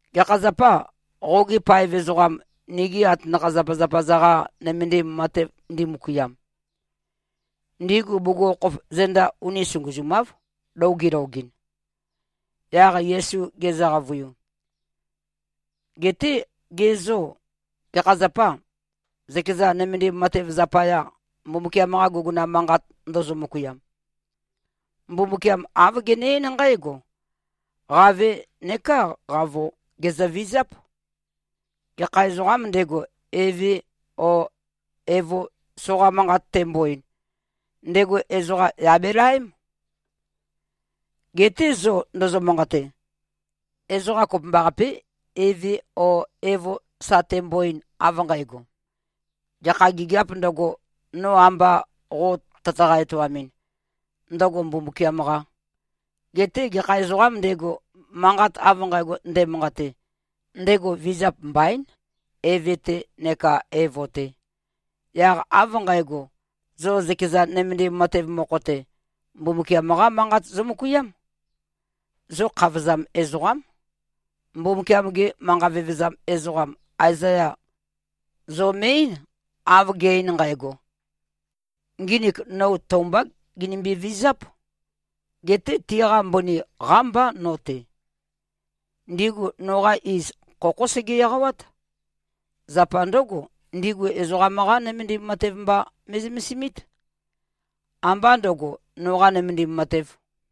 “Gekha zapâ, qogi paev ezoqam, nigi atanakha-zapazapa-za-qa nømendim matev ndimøkuiam? Ndigu bugukhokhof zenda uni sunguzumáv, lou gilogɨn.” Yaq Yesu gezø-qavøiu, “Geté ge zô, gekha zapâ, zøkeza nømendim matev zapaya, Mbumbukiam-qa guguna manqat ndozo-møkuiam? Mbumbukiam āv gene-eín nqǽgo, ‘Qave neká qavo, gèzøvizáp. Gekha ezoqām ndego, eve o evo soqa manqat tembo-ein, ndego ezoqa yà belaém.’ Geté zo ndozo-manqate, ezoqa kopømbaqapé, eve o evo sa tembo-ein, av nqægo, gekha gigiāp ndøgo, no amba qo tøtaqa-etoamɨn, ndøgo Mbumbukiam-qā. Geté gekha ezoqām ndego, manqat av nqægo nde꞉manqate, ndego vizap mbaín, eve-te neka evo-te. Yaq av nqægo, zo zøkeza nømendim matev mokho-te, Mbumbukiam-qá Manqat zomøkuiám. Zo khavozam ezoqám. Mbumbukiam-ge manqa vevezam ezoqam Aezaya, zo me꞉-eín, av ge꞉-ein nqægo, ‘Nginik no tou mbá ginømbe-vizáp. Geté tiqa mbøni qámbá no-te. Ndigu noqa iz, khokhó sege-eqawát. Zapa ndǿgo, ndigu ezoqam-qá nømendim matev mba me꞉zømesimít. Ambá ndøgo, noqā nømendim matev.’”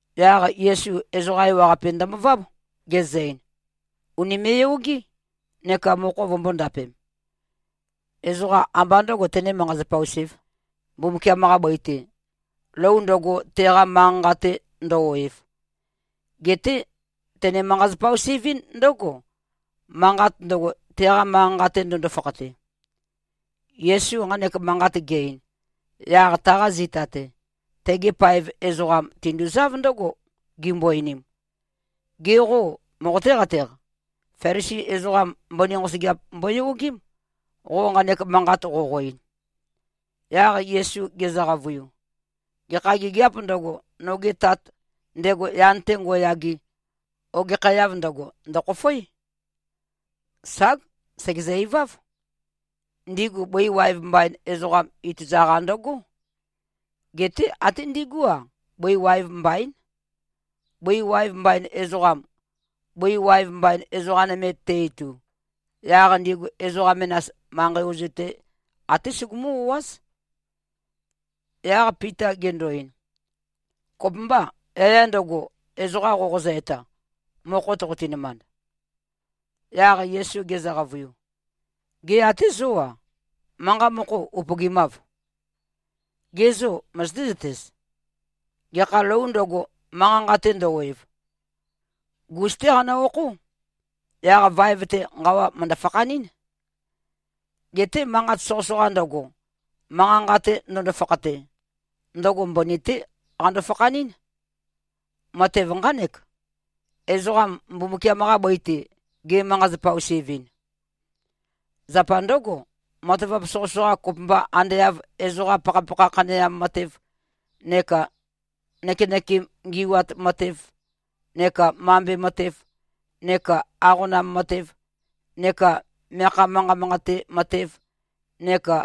Yaq Yesu ezoqa ewaqape ndømøváb, gezø-ein, “Ùnime꞉-yogé, neka mokho vømbō-ndapem! Ezoqam ambá ndø̄go, tenē-manqa-zapa-us-ēv, Mbumbukiam-qa bøi-te, lou ndøgo, teqa manqa-nqa-te ndø-oev. Geté tene-manqa-zapa-us-evɨ́n ndǿgo, manqat ndøgo, teqa manqa-nqa-te ndøndo-fakhate.” Yesu nqanek manqat ge-ein, yaq taqa zita-te, tegi paev ezoqam tinduzáv ndǿgo, gimbo-einim, “Ge qô, moqoté-qateq? Felisi ezoqam mbøni nqosøgeap mboyogém, qo nqanek manqat qoqo-ein.” Yaq Yesu gezø-qavøiu, “Gekha gigiāp ndøgo, noge Tat, ndego yan-te ngo꞉yage, ogekhæav ndøgo, ndø̀khofoé. Ság! Sègezø-iváv. Ndigu bøi waev mbain ezoqam ituza-qa ndøgó. Geté até ndigú-a, bøi waev mbaín. Bøi waev mbain ezoqam, bøi waev mbain ezoqa nøme te-itu, yaq ndigu ezoqa menas, manqei ozu-te, até sugumú-o꞉áz.” Yaq Pita gendo-ein, “Kopømbâ, yaya ndøgo, ezoqa qoqozø-eta, mokho toqoti-nømand?” Yaq Yesu gezø-qavøiu, “Gê, até zó-a, manqa mokho upøgimâv? Ge zô, møzøté-zøtez? Gekha lōu ndøgo, manqa-nqa-te ndø-oev, gus-té qanø-okhó. Yaq vaev-te nqawa mø̀ndø-fakhanɨ́n. Geté manqat soqøsoqa ndøgo, manqa-nqa-te ndøndo-fakhate, ndøgo mbøni-té qando-fakhanɨ́n. Matev nqánek, ezoqam Mbumbukiam-qa bøi-te ge꞉-manqa-zapa-us-evɨn. Zapa ndǿgo, matavap soqøsoqa, kopømba ande av ezoqam pakhapakha khaneam matev neka nøkenøkem ngi꞉wat matev neka mambe matev neka aqonam matev neka meakha manqat manqate matev neka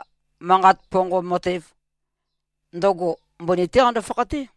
manqat ponqom matev, ndøgo mbøni-té qando-fakhaté.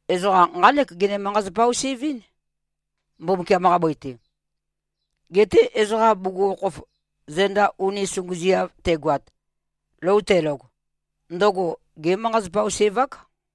Ezoqam nqánek gene-manqa-zapa-us-ev-ɨ́n, Mbumbukiam-qa bøi-te. Geté ezoqam bugukhokhof zenda uni sunguziav tegoat, lou telog, ndøgo gé꞉-manqa-zapa-us-ev-ák.”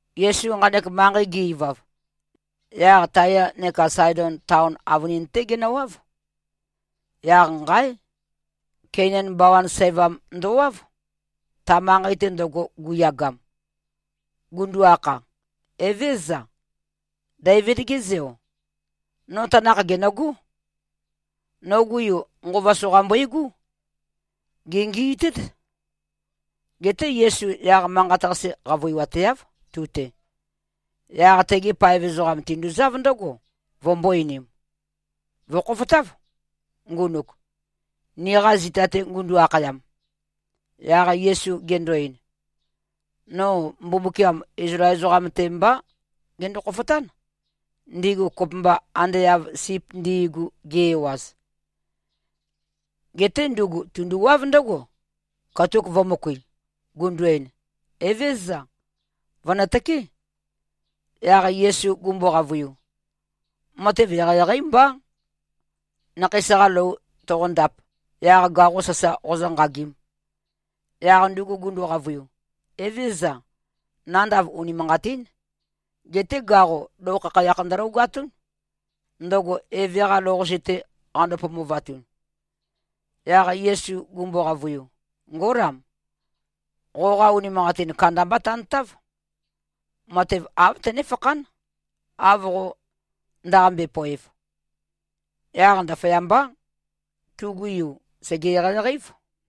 Yesu nqanek manqei ge-ivav, yaq Taya neka Saedon taon avønin-té genøwáv. Yaq nqáe! Keinan bawan sævam ndøwáv, ta manqei-te ndøgo guyagam, gundu-akha, “Evézøza. Deivid-ge Zeo. No tanakh gènøgó. Nogu yu, nqova soqa mbøigú. Gèngiitét.” Geté Yesu yaq manqat-qase qavøiwateáv, tu-te. Yaq tegi paev ezoqam tinduzáv ndǿgo, vømbō-einim, “Vø̀khofotáv, ngunuk, niqa zita-te ngundu-akhayam.” Yaq Yesu gendo-ein, “No Mbumbukiam Izlael ezoqam-te mbá gendo-khofotán, ndigu kopømba ande av sip ndi꞉gu, gi-ewaz.” Geté ndugu tunduwáv ndǿgo, katuk vø̄møkui, gundu-ein, “Evézøza. Vø̀nøtøké.” Yaq Yesu gumbo-qavøiu, “Matev eqeieqeí mbá, nakheis-qa lou toqondap, yaq gaqo sasa qozǿnqagīm.” Yaq ndugu gundu-qavøiu, “Evézøza. Nandav unimanqatín. Geté gaqo, lou khakhayakh ndølogatún, ndøgo eve-qa lou-qase-te qando-pomovatun.” Yaq Yesu gumbo-qavøiu, “Ngólam. Qoqa unimanqatin kandambá tantáv. Matev āv tønéfakhán, av qo ndaqambe-poev.” Yaq ndaføyambá, tugu yu sège-eqeieqei-év.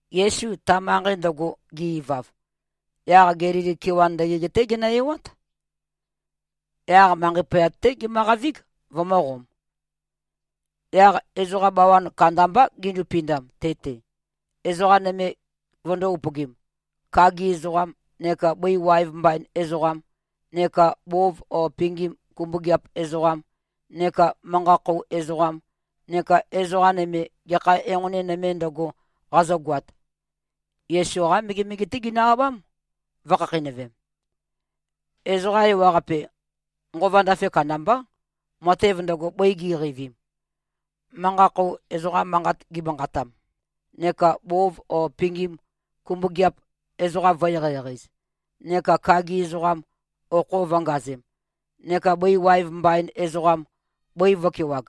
Yesu ta manqei ndøgo ge-ivav, yaq Gelili kewan ndøgeg-té genø-ewát. Yaq manqei poyat-té gemøqavíg, vømø̄qom. Yaq ezoqa bawan kandambá gindupindam te-te, ezoqa nøme vøndó-upøgim, kagi ezoqam neka bøi waev mbain ezoqam neka bov o pingim kumbøgeap ezoqam neka manqa-khou ezoqam neka ezoqa nøme, gekha enqoni nøme ndøgo, qazøgoat. Yesu-qá megemege-té ginø-abám, vø̄khakheinøvem. Ezoqa ewaqape nqova ndafe kandambá, matev ndøgo, bøi gi꞉qeivim, manqa-khou ezoqam manqat gimanqatam, neka bov o pingim kumbøgeap ezoqam vø̄-eqeieqei-ez, neka kagi ezoqam okho vø̄ngazem, neka bøi waev mbain ezoqam, bøi vø̄kewag.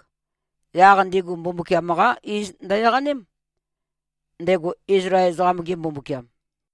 Yaq ndigu Mbumbukiam-qá iz ndø-eqánem, ndego Izlael ezoqam-ge Mbumbukiam.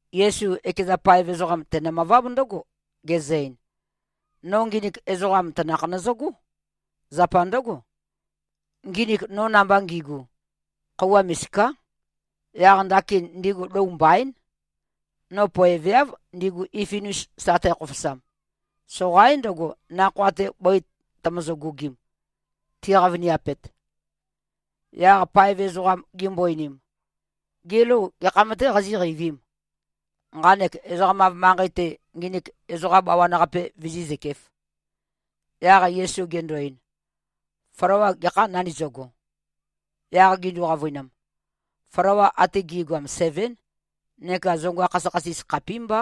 Yesu ekeza paev ezoqam tenø-møváb ndǿgo, gezø-ein, “No nginik ezoqam tanakh nøzøgó. Zapa ndǿgo, nginik no namba ngigu, khøuwa misiká. Yaq ndakin ndigu lou mbaín. No poeveáv, ndigu ififin-us sa tækhofosam. Soqaín ndøgo, nakhoa-te bøi tømøzø-gugim, ti꞉qavoniapet.” Yaq paev ezoqam gimbo-einim, “Gê, lou gekham-tē qazíqeivīm, nqanek ezoqam-av manqei-te, nginik ezoqa bawan-qape vizí꞉zøkēf.” Yaq Yesu gendo-ein, “Flawa gekhâm nandizøgo?” Yaq gindu-qavøinam, “Flawa ate gi꞉goam sevén neka zonga khasøkhasis khapímbá.”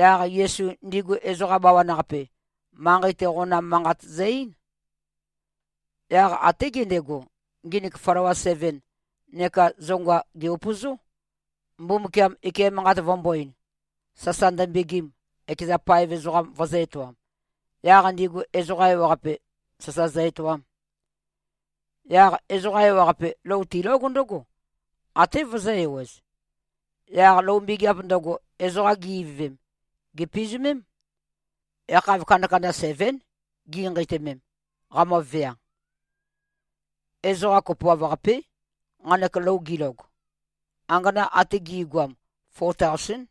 Yaq Yesu ndigu ezoqa bawan-qape, manqei-te qonam manqat zø-eín. Yaq até gendego, nginik flawa seven neka zonga, gè-upøzó, Mbumbukiam ike manqat vømbō-ein, sasa ndømbegim, ekeza paev ezoqam vøzø̄-etoam, yaq ndigu ezoqa ewaqape sasa zø-etoam. Yaq ezoqa ewaqape lou tilóg ndǿgo, até vøzø̄-ewez. Yaq lou mbegeap ndøgo, ezoqa gi-ivøvem, gèpizumém. Yakhav kandakanda sevén, ginqeitømem, qamøvea. Ezoqa kopoav-qapé, nqanek lou gilog. Angana ate gi꞉goam, fo taosén.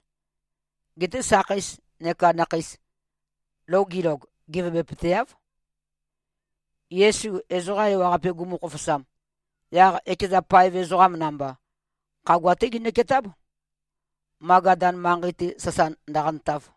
Geté sakheis neka nakheis, lou gilog, gevebøpøteáv. Yesu ezoqa ewaqape gumu-khofosam, yaq ekeza paev ezoqam namba, khagua-té ginøketáb, Magadan manqei-te sasa ndøqantav.